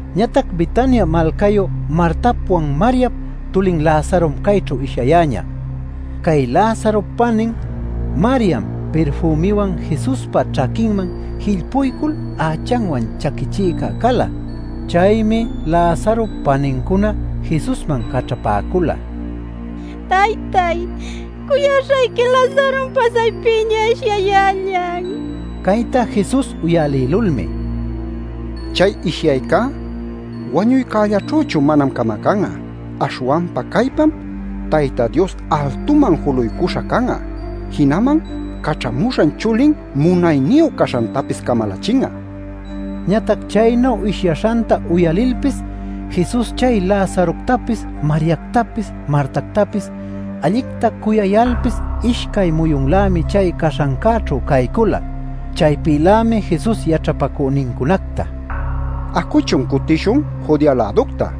Ñatac Betania malcayu Martapwan Mariap tulin Lazarom chayćhu ishyayäña. (Cay Lazarop panin Mariam pirfümiwan Jesuspa ćhaquinman jillpuycul ächanwan chaquichïca cala.) Chaymi Lazarop panincuna Jesusman caćhapäcula: “Taytay, cuyaśhayqui Lazarom pasaypiña ishyayällan” nil. Cayta Jesus uyalïlulmi: “Chay ishyaycá wañuycällaćhüchu manam camacan'a. Aśhwanpa caypam Tayta Dios altuman juluycuśha can'a jinaman caćhamuśhan chulin munayniyu caśhantapis camalachin'a” nin. Ñatac chaynu ishyaśhanta uyalilpis Jesus chay Lazaroctapis, Mariactapis, Martactapis allicta cuyayalpis ishcay muyunlämi chay caśhancächu caycula. Chaypïlämi Jesus yaćhapacünincunacta: “Acuchun cutishun Judea-läducta” nin.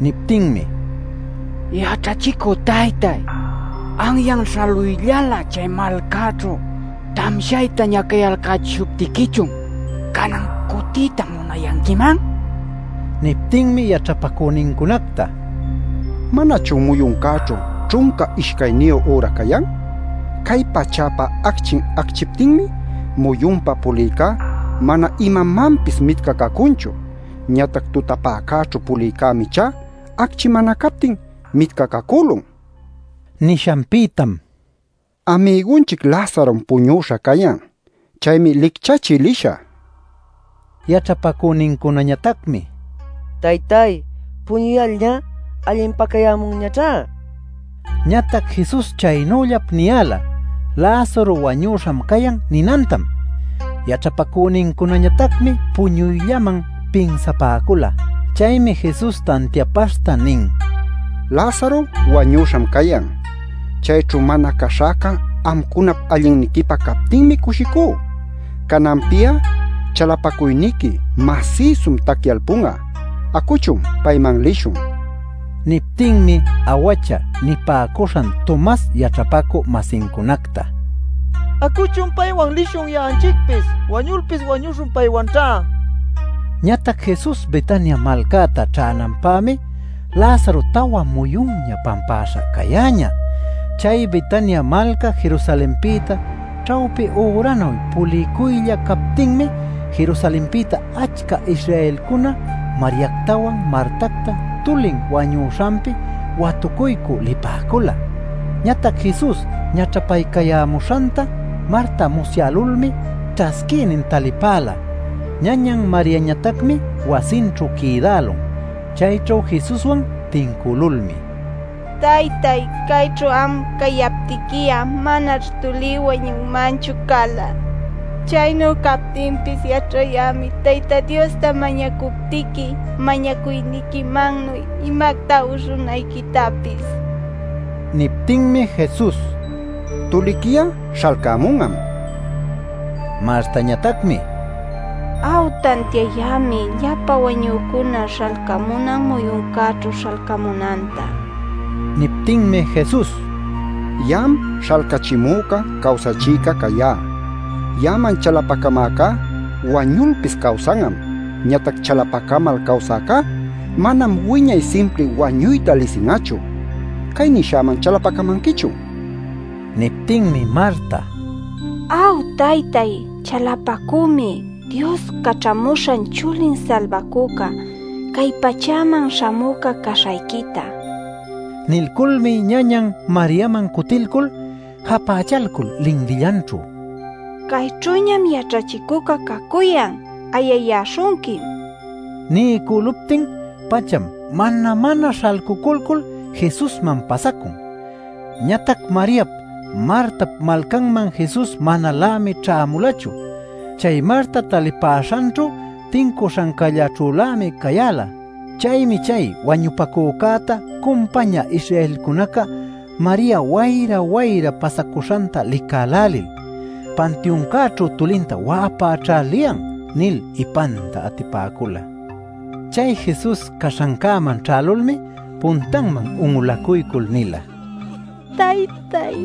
Niptinmi: “Yaćhachicü taytay, anyan śhaluyllalä chay malcäćhu tamshayta ñacayalcäśhuptiquichun ¿canan cutiyta munayanquiman?” nipäcun. Niptinmi yaćhapacünincunacta: “¿Manachun muyuncäćhu ćhunca ishcayniyu üra cayan? Cay pachäpa acchin acchiptinmi muyunpa pulïcá mana imamanpis mitcacacunchu. Ñatac tutapäcäćhu pulïcämi ichá, acchi mana captin mitcacacülun” nin. Nishanpïtam: “Amigunchic Lazarom puñüśha cayan. Chaymi licchachï lishä” nin. Yaćhapacünincunañatacmi: “Taytay, puñuyalñá allinpacayämunñaćhá” nipäcula. Ñatac Jesus chaynüllap niyäla: “Lazaro wañüśham cayan” ninantam. Yaćhapacünincunañatacmi puñuyllaman pinsapäcula. Chaymi Jesus tantiapaśhta nin: “Lazaro wañüśham cayan. Chayćhu mana caśhäca amcunap allinniquipä captinmi cushicú. Cananpi'a chalapacuyniqui masïsum tacyalpun'a. Acuchun, payman lishun” nin. Niptinmi “Awacha” nipäcuśhan Tomas yaćhapacü-masincunacta: “Acuchun paywan lishun ya'anchicpis, wañulpis wañuśhun paywanćha” nin. Ñatac Jesus Betania malcäta ćhänanpämi Lazaro tawa muyunña pampäśha cayäñä. Chay Betania malca Jerusalenpïta ćhawpi üranuy puliycuylla captinmi Jerusalenpïta achca Israelcuna Mariactawan Martacta tulin wañuśhanpi watucuycü lipäcula. Ñatac Jesus ñaćhapaycayämuśhanta Marta musyälulmi ćhasquïnin talipäla; ñañan Mariañatacmi wasinćhu quïdälun. Chayćhu Jesuswan tincülulmi: “Taytay, cayćhu am cayaptiqui'a manaćh tulí wañunmanchu cala. Chaynu captinpis yaćhayämi Tayta Diosta mañacuptiqui mañacuyniquimannuy imacta uśhunayquitapis” nin. Niptinmi Jesus: “Tuliqui'a śhalcämun'am” nin. Martañatacmi: “Aw, tantiayämi llapa wañücuna śhalcamunan muyuncäćhu śhalcamunanta” nin. Niptinmi Jesus: “Ya'am śhalcachimüca cawsachïca cayá. Ya'aman chalapacamäcá wañulpis cawsan'am. Ñatac chalapacamal cawsäcá manam wiñay simpri wañuyta lisin'achu. ¿Cay nishäman chalapacamanquichun?” nin. Niptinmi Marta: “Aw taytay, chalapacümi Dios Caćhamuśhan Chulin Salbacüca, cay pachäman śhamüca caśhayquita” nin. Nilculmi ñañan Mariaman cutilcul japächalcul linlillanćhu: “Cayćhüñam yaćhachicüca cacuyan. Ayayäśhunquim” nin. Niycüluptin-pacham mana-mana śhalcuculcul Jesusman pasacun. Ñatac Mariap, Martap malcanman Jesus manalämi ćhämulachu. Chay Marta talipäśhanćhu tincuśhancällaćhülämi cayäla. Chaymi chay wañupacücäta cumpañä Israelcunaca Maria wayra-wayra pasacuśhanta licälälil “Pantiuncäćhu tulinta wa'apäćha liyan” nil ipanta atipäcula. Chay Jesus caśhancäman ćhälulmi puntanman un'ulacuycul nila: “Taytay,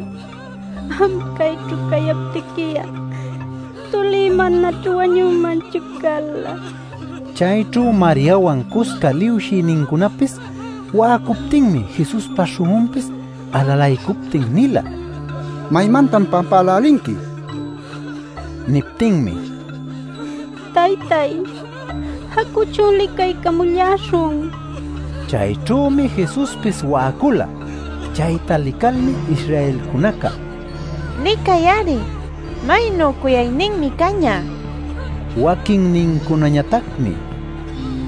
am cayćhu cayaptiqui'a tulí manaćh wañunmanchu cala” nil. Chayćhu Mariawan cusca liwshïnincunapis wa'acuptinmi, Jesuspa śhun'unpis alalaycuptin nila: “¿Maymantan pampälälinqui?” nil. Niptinmi: “Taytay, acuchun licaycamulläśhun” nil puśhapäcula. Chayćhümi Jesuspis wa'acula. Chayta licalmi Israelcunaca: “Licay-ari, ¡maynu cuyayninmi cañä!” nipäcun. Waquinnincunañatacmi: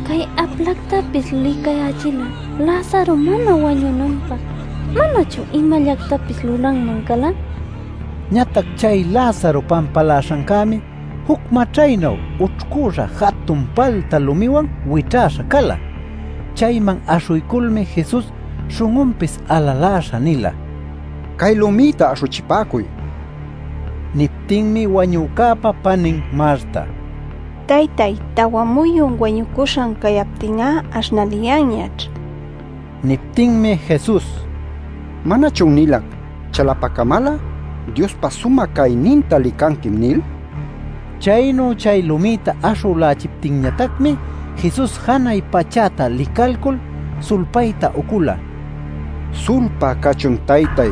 “Cay aplactapis licayächil'a Lazaro mana wañunanpä ¿manachun imallactapis lulanman cala?” nila. Ñatac chay Lazaro pampaläśhancämi juc maćhaynuy ućhcüśha jatun palta lumiwan wićhäśha cala. Chayman aśhuyculmi Jesus śhun'unpis alaläśha nila: “Cay lumïta aśhuchipäcuy” nil. Niptinmi wañücäpa panin Marta: “Taytay, tawa muyun wañucuśhan cayaptin'a aśhnaliyanñaćh” nin. Niptinmi Jesus: “¿Manachun nilac ‘Chalapacamal'a Diospa sumä cayninta licanquim?’ nil” nin. Chaynu chay lumïta aśhülächiptinñatacmi Jesus janay pachäta licalcul sulpayta ucula: “Sulpá cachun taytay,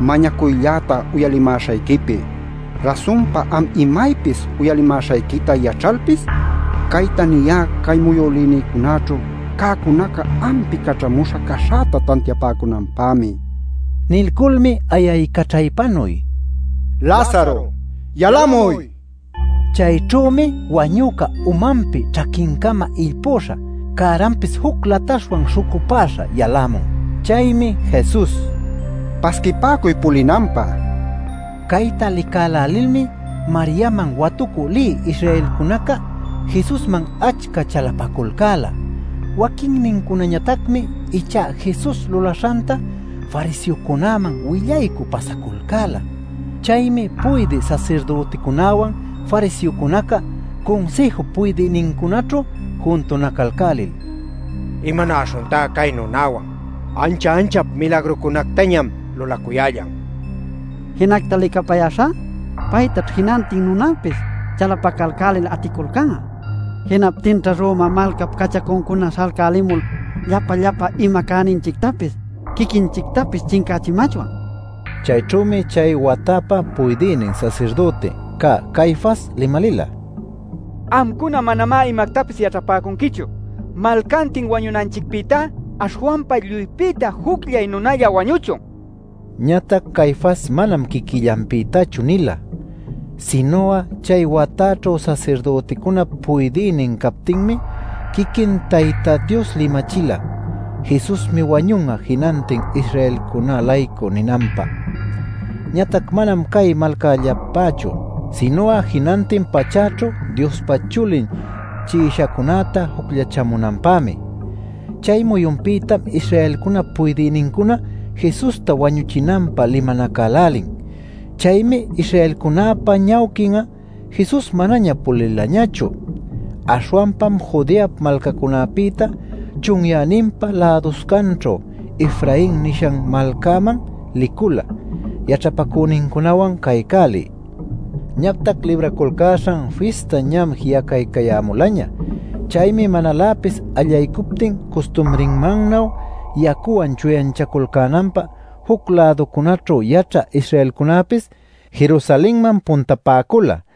mañacuylläta uyalimäśhayquipi. Rasunpa am imaypis uyalimäśhayquita yaćhayalpis, cayta niyá cay muyülïnïcunaćhu cäcunaca ampi caćhamuśha caśhäta tantiapäcunanpämi” nil. Nilculmi ayaycaćhaypanuy “¡Lazaro, yalamuy!” nin. Chayćhümi wañüca umanpi ćhaquincama illpüśha, cäranpis juc lataśhwan śhucupäśha yalämun. Chaymi Jesus: “Pasquipäcuy pulinanpä” nin. Cayta licälälilmi Mariaman watucü lï Israelcunaca Jesusman achca chalapaculcäla. Waquinnincunañatacmi ichá Jesus lulaśhanta fariseocunäman willaycü pasaculcäla. Chaymi puydï sasirdüticunäwan fariseocunaca Cunsïjup puydïnincunaćhu juntunacalcälil: “¿Imanäśhuntá cay nunäwan? Ancha anchap milagrucunactañam lulacuyällan. Jinacta licapayäśhá, paytaćh jinantin nunäpis chalapacalcälil aticulcan'a. Jinaptinćha Roma malcap cachacuncuna śhalcälimul llapa llapa ima cäninchictapis, quiquinchictapis chincächimachwan” ninacücuyalcan. Chayćhümi chay watapä puydïnin sasirdüti cä Caifas limalïla: “Amcuna manamá imactapis yaćhapäcunquichu. Malcantin wañunanchicpïtá aśhwanpa lluypïta jucllay nunalla wañüchun” nil. Ñatac Caifas manam quiquillanpïtachu nila. Sinu'a chay wataćhu sasirdüticunap puydïnin captinmi quiquin Tayta Dios limachila “Jesusmi wañun'a jinantin Israelcunä-laycu” ninanpä. Ñatac manam cay malcallapächu sinu'a jinantin pachäćhu Diospa Chulin chi'ishacunäta jucllachamunanpämi. Chay muyunpïtam Israelcunap puydïnincuna Jesusta wañuchinanpä limanacälälin. Chaymi Israelcunäpa ñawquin'a Jesus manaña pulilañachu. Aśhwanpam Judeap malcancunapïta, chunyäninpa läduscanćhu Efrain nishan malcaman licula yaćhapacünincunawan caycälï. Ñatac Libraculcäśhan Fista ñam ji'acaycayämulaña. Chaymi manaläpis allaycuptin custumrinmannuy yacuwan chuyanchaculcänanpä juc-läducunaćhu yaćhä Israelcunäpis Jerusalenman puntapäcula.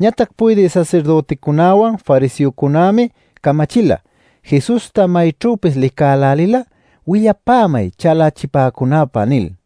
Ñatac puydï sasirdüticunäwan fariseocunämi camachila “Jesusta mayćhüpis licälälil'a willapämay chalachipäcunäpä” nil.